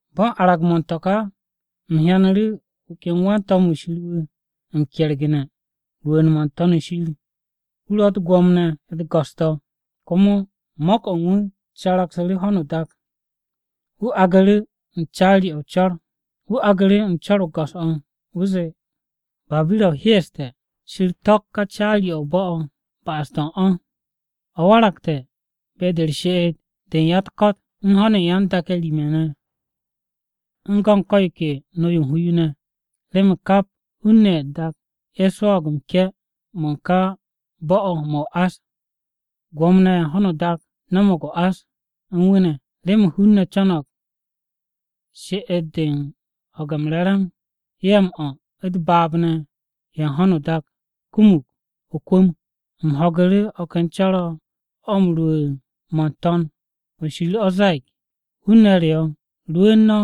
Bo̱ u̱n arag-mo̱ u̱n to̱ ka, u̱m hyanu̱ru̱ wu̱ ken wan-to̱m-wu̱ Shir wu̱ m-kergu̱ne̱ rwu̱u̱n-mo̱ n-To̱n shir. Wu̱ ro̱ u̱t-gwo̱mo ne̱ u̱t-go̱s ne̱, komo mo̱k-o̱ u̱n wu̱ caragsu̱ru̱ ho̱no o-dak. Wu̱ aagu̱ru̱ u̱n co̱r-o go̱s-o̱, wu̱ zee, “Babira-o hyeeste̱! Shir to̱k ka caari-o̱ o-bo̱ o̱ ba'as-to̱ u̱n o̱! O̱ waragte̱ be-de u̱r-she'et de ya-u̱t-ko̱t u̱n ho̱n u̱n yan-dak-ye̱ rim-ye̱ ne̱ u̱n go̱ u̱n ko̱ yo ke no-yo u̱n hu yo ne̱. Remen kap hun-ne̱ ye̱ u̱t-dak ye̱ swo̱o̱g m-ke̱ mo̱ u̱n ka bo̱-o̱ mo̱ o-ás. Gwo̱mo-ne̱ ye̱ u̱n ho̱no o-dak no̱mo̱g o-ás u̱n o̱ ne̱. Remen hun-ne̱ co̱no̱g she'et-de u̱n ho̱ge̱ m-re̱re̱m, ya-m-o̱, u̱t-baab ne̱ ye̱ u̱n ho̱no o-dak kumug o-kwu̱m.” U̱m ho̱gu̱ru̱ o̱ ken co̱r-o̱ rwu̱u̱n-mo̱ n-To̱n o̱ shir o̱ ze̱e̱g, “Hun-ne̱ re o̱, rwu̱u̱n no̱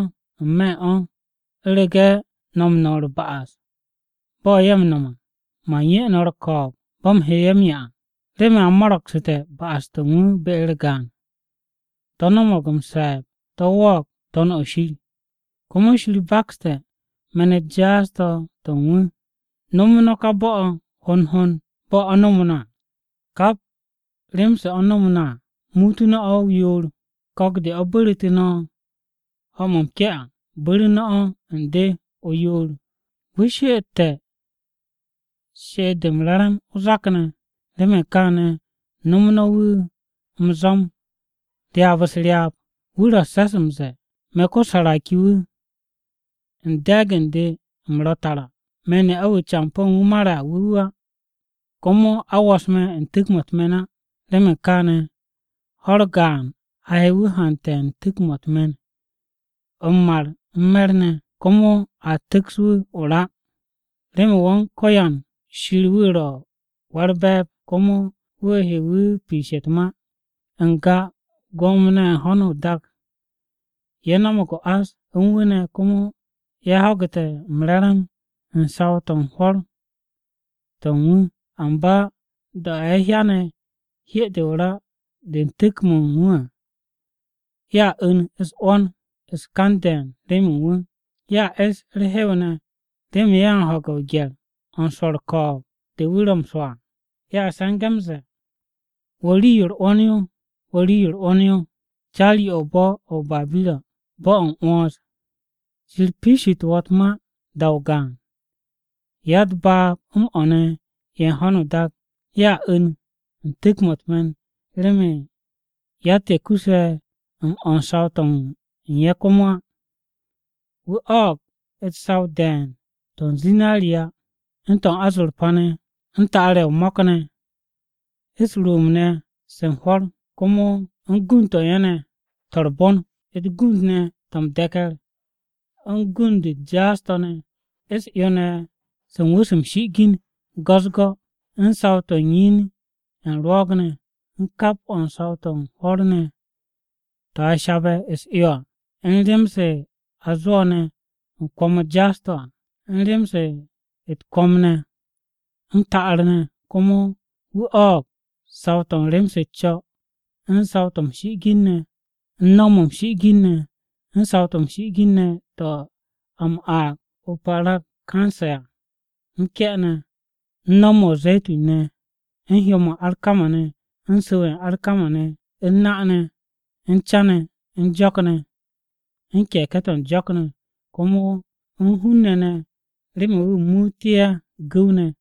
n-me̱ u̱n o̱! U̱rege̱ no̱ m-no̱m u̱r-ba'as bo̱ ye̱ m-no̱m à, Man 'ye no̱ u̱r-ko̱o̱b bo̱ u̱m he ye̱ m-'ya à. Remen a mo̱ro̱gsu̱te̱ ba'as-to̱ u̱n o̱ be-u̱r gaan, to̱ nomog m-se̱e̱b to̱ wo̱o̱g To̱n-o shir. Komo Shir bakste̱ me̱n-u̱t jaas-to̱ to̱ u̱n o̱. No̱mu̱ no̱ ka bo̱-o̱ hond hond bo̱ o̱ no̱mu̱ no̱ à, kap bo̱ u̱n rem-se o̱ no̱mu̱ no̱ à muutu̱ no̱ o̱ o-yoor. Ko̱k-de o̱ bu̱ru̱tu̱ no̱ ho̱-mo̱ m-ke̱ à bu̱ru̱ no̱ o̱ u̱n de o-yoor. O̱ she'ette̱ she'et-de m-se̱ps o-zak ne̱, remen kaane̱ no̱mu̱ no̱ o̱ m-zo̱m ryaab-u̱s u̱s-ryaab. O̱ ro̱ u̱s-se̱s m-ze̱e̱, ‘Me̱, ko-saraki-wu̱, u̱n de̱e̱g u̱n de u̱m ro̱ tara! Me̱ ne'a-wu̱ campo̱ u̱n wu̱ mare̱ à wu̱ wu̱ á. Komo a wo̱s me̱ u̱n tu̱k-mo̱ u̱t-me̱n á!’ Remen kaane̱, ho̱-u̱r gaan a he wu̱ m-hante̱ u̱n tu̱k-mo̱ u̱t-me̱n, m-mar, u̱n me̱r ne̱. Komo a tu̱ks wu̱ o-ra. Remen Wan-Ko̱yan Shir wu̱ ro̱ Wa-u̱r-Be̱e̱b, komo wu̱ he wu̱ piishe̱ u̱t-ma. “N-ga, gwo̱mo-ne̱ ye̱ u̱n ho̱no o-dak ye̱ no̱mo̱g o-ás u̱n wu̱ ne̱ komo ye̱ ho̱gu̱te̱ m-re̱re̱m u̱n saw-to̱ u̱n hwo̱r to̱ u̱n wu̱. Amba da-o̱ ye̱ hyane̱ hye-de o-ra de u̱n tu̱k-mo̱ u̱n wu̱ à, ye̱a 'u̱n-u̱s-'wo̱n u̱n u̱s-kan ne̱ de̱e̱n remen wu̱. Ye̱a es u̱r-hew ne̱ remen ye̱ u̱n ho̱ge̱ o-gye̱r o̱ u̱n swo̱ u̱r-ko̱o̱b de wu̱ ro̱ m-swo̱ à. Ye̱a se̱nge̱ m-ze̱e̱, “ ‘Wo̱ rii-yo u̱r-'wo̱n yo! Wo̱ rii-yo u̱r-'wo̱n yo, caari-o̱ o-bo̱ o̱ o-Babira, bo̱-o̱ u̱r-'wo̱n! Shir piishitu̱ wo̱ u̱t-ma da-o gaan!’ “Ya-u̱t-baab m-o̱ ne̱ ye̱ u̱n ho̱no o-dak ye̱a 'u̱n u̱n tu̱k-mo̱ u̱t-me̱n, remen yatt-ye̱ kuse̱ m-o̱ u̱n saw-to̱ u̱n ye̱ komo á. Wu̱ o̱o̱g u̱t-saw de̱e̱n to̱ u̱n zinariya u̱n to̱ u̱n azorpa ne̱, u̱n ta'ar-ye̱ o-mo̱k ne̱, u̱s-rwu̱u̱mb se u̱n hwo̱r ne̱, komo u̱n gund-to̱ u̱n ye̱ ne̱ to̱ u̱r-bon, u̱t-gund ne̱ to̱ m-de̱ke̱r, u̱n gund-u̱t jaas-to̱ ne̱, u̱s-'yo ne̱ se u̱n wú̱s m-shi'igin go̱-u̱s u̱s-go̱, u̱n saw-to̱ u̱n yin-ye̱ u̱n rwo̱o̱g-ne̱, u̱n kap o̱ u̱n saw-to̱ u̱n hwo̱r ne̱ to̱ a shabe̱ u̱s-'yo à, u̱n rem-se a zwo̱ ne̱ u̱n kwo̱m-u̱t jaas-to̱ à, u̱n rem-se u̱t-kwo̱m ne̱, m-ta'ar ne̱. Komo wu̱ o̱o̱g saw-to̱ u̱n rem-se u̱s-co̱, u̱n rii-yo m-shi'igin ne̱, u̱n no̱w-mo̱ m-shi'igin ne̱, u̱n o-mur, u̱n rii-yo m-shi'igin ne̱ to̱ a m-aag o-parakanse à, m-ke̱ ne̱, u̱n no̱w-mo̱ o-ze̱tun ne̱, u̱n hyò-mo̱ u̱n arkama-ne̱, u̱n su̱w-ye̱ u̱n arkama-ne̱, u̱n na-ne̱, u̱n ca-ne̱, u̱n jo̱k-ne̱, u̱n ke̱ke̱-to̱ u̱n jo̱k-ne̱, komo u̱n hun-ne̱ ne̱ remen wu̱ muute̱ ye̱ gu̱w-ne̱.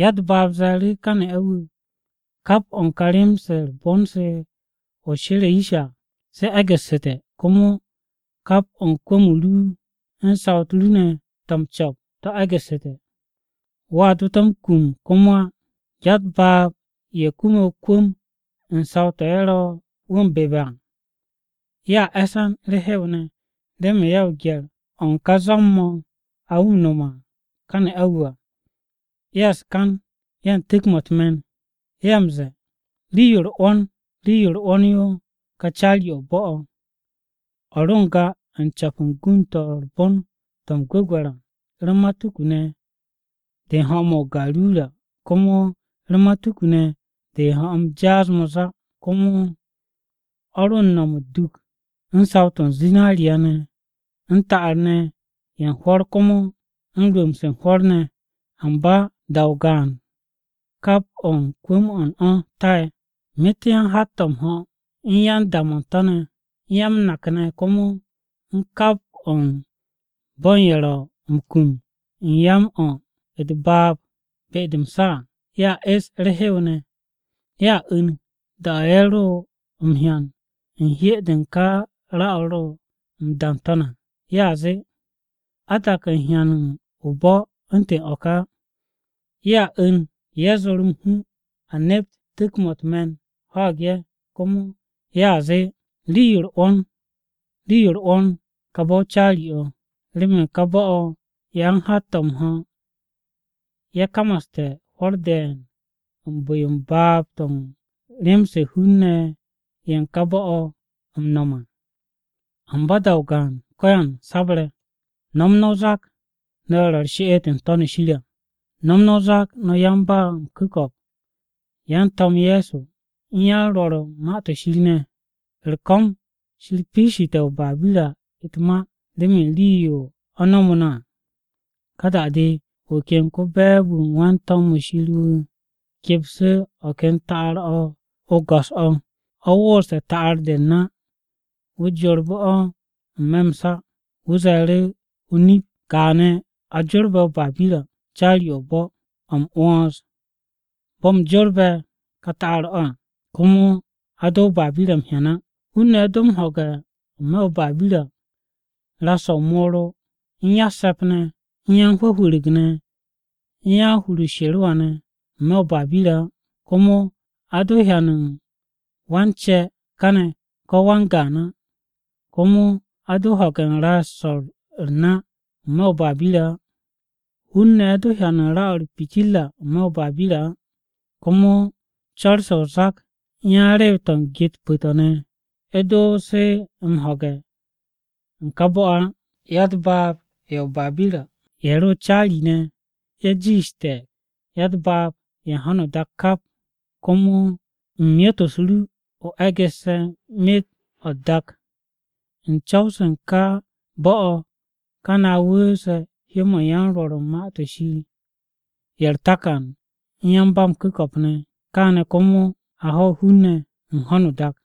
“Ya-u̱t-baab ze̱e̱ru̱ ka ne'a-wu̱, ‘Kap o̱ u̱n ka rem-se u̱r-bon se o she̱re̱ yish à se egu̱ssu̱te̱ komo kap o̱ u̱n kwu̱m-o ru u̱n saw-u̱t ru ne̱ to̱ m-co̱p to̱ egu̱ssu̱te̱. Wo̱a do to̱ m-kum komo á!’ Ya-u̱t-baab ye̱ kume̱ o-kwu̱m u̱n saw-to̱ ye̱ ro̱ wu̱ m-bebe̱ à, ye̱a e̱se̱n u̱r-hew ne̱, remen ye̱ o-gye̱r o̱ u̱n ká zo̱m-mo̱ a m-nome̱ u̱n ka ne'a-wu̱ à. Ye̱ u̱s-kan, ye̱ u̱n tu̱k-mo̱ u̱t-me̱n. Ye̱ m-ze̱e̱, “ ‘Rii-yo u̱r-'wo̱n! Rii-yo u̱r-'wo̱n yo ka caari-o̱ o-bo̱ o̱! O̱ ro n-ga u̱n co̱p u̱n gund-to̱ u̱r-bon to̱ m-gwu̱gwe̱r à, u̱r-matuku ne̱ de u̱n ho̱-mo̱ u̱n o-garura, komo u̱r-matuku ne̱ de u̱n ho̱-m jaas-mo̱ záá, komo o̱ ro u̱n no̱m u̱t-duk u̱n saw-to̱ u̱n zinariya, u̱n ta'ar ne̱ ye̱ u̱n hwo̱r komo u̱n rwu̱u̱mb-se u̱n hwo̱r ne̱! Amba da-o gaan kap o̱ u̱n kwu̱m-o̱ u̱n o̱ tae̱!’ “Myet-o̱ u̱n yan-hat-to̱ m-ho̱ u̱n yan-da-mo̱ u̱n to̱ ne̱, u̱n ya-m-nak ne̱ komo u̱n kap o̱ u̱n bo̱ u̱n ye̱ ro̱ m-kum u̱n ya-m-o̱ u̱t-baab ne̱ be-de m-sa à, ye̱a e̱s u̱r-hew ne̱. Ye̱a 'u̱n, da-o̱ ye̱ ro m-hyan u̱n hye-de u̱n ka ra-o̱ ro̱ m-da n-to̱n à. Ye̱a zee, ‘A tak u̱n m-hyan o-bo̱ u̱ntu̱n o̱ ka á!’ Ye̱a 'u̱n ye̱ zo̱r m-hu a nept tu̱k-mo̱ u̱t-me̱n ho̱o̱g ye̱. Komo ye̱a zee, “ ‘Rii-yo u̱r-'wo̱n, rii-yo u̱r-'wo̱n, kà bo̱-o caari-o̱! Remen ká bo̱-o̱, yan-hat-o̱ m-ho̱ ye̱ kamaste̱ hwo̱r de̱e̱n u̱n bu̱-yo baab-to̱ u̱n rem-se hun-ne̱ ye̱ u̱n ká bo̱-o̱ m-no̱m à. Amba da-o gaan ko̱yan sabre̱! No̱m no̱ o-zak, no̱ ye̱ ro̱ u̱r-she'et n-To̱n shir à, no̱m no̱ o-zak no̱ yan-ba-m-ku̱ko̱p, yan-To̱m Ye̱so, u̱n yan-Rwo̱r u̱n Ma-to̱ Shir ne̱. U̱r-ko̱m Shir piishite̱ o-Babira u̱t-ma remen rii-yo o̱ no̱mu̱ no̱ à!’” Ka da-de wu̱ ken ko-be̱e̱b-wu̱ u̱n wan-to̱m-wu̱ Shir wu̱ kepsu̱ o̱ ken ta'ar-o̱ o-go̱s o̱ o̱ woose̱ ta'ar-de u̱n u̱r-na à. Wu̱ jorbu̱ o̱ n-me̱ m-sa, wu̱ ze̱e̱ru̱, “O-nip kaane̱ a jorbe̱ o-Babira caari-o̱ o-bo̱, o̱ m-'wo̱ns, bo̱ u̱m jorbe̱ ka ta'ar-o̱ à, komo a do o-Babira m-hyan á. Hun-ne̱ a do m-ho̱ge̱ n-me̱ o-Babira ras-o̱ o-moro, u̱n ya-u̱t-se̱p ne̱, u̱n yan-hwu̱hwu̱ru̱g ne̱, u̱n yan-hur u̱s-sherewa ne̱ n-me̱ u̱n o-Babira á. Komo a do hyan u̱n wan-ce̱ kane̱ ko̱ wan-gaan á. Komo a do ho̱ge̱ u̱n ras-o̱ u̱r-na n-me̱ o-Babira á. Hun-ne̱ do hyan ra-o̱ u̱r-pitirra n-me̱ o-Babira á. Komo co̱r-se o-zak u̱n yan-rew-to̱ u̱n ge-u̱t pu̱-to̱ ne̱ a do se m-ho̱ge̱ u̱n ka bo̱-o̱ á. Ya-u̱t-baab ye̱ o-Babira ye̱ ro caari-ne̱, ye̱ ro jiishte̱ ya-u̱t-baab ye̱ u̱n ho̱no o-dak kap à, komo u̱n myot-u̱s ru o̱ o e̱gu̱sse̱ myet-o̱ u̱t-dak! U̱n co̱w-se u̱n ka bo̱-o̱ kane̱ a wu̱u̱se̱ hyó-mo̱ u̱n yan-Rwo̱r u̱n Ma-to̱ Shir ye̱ u̱r-takan u̱n yan-ba-m-ku̱ko̱p ne̱. Kane̱ komo a ho̱ hun-ne̱ u̱n ho̱no o-dak.”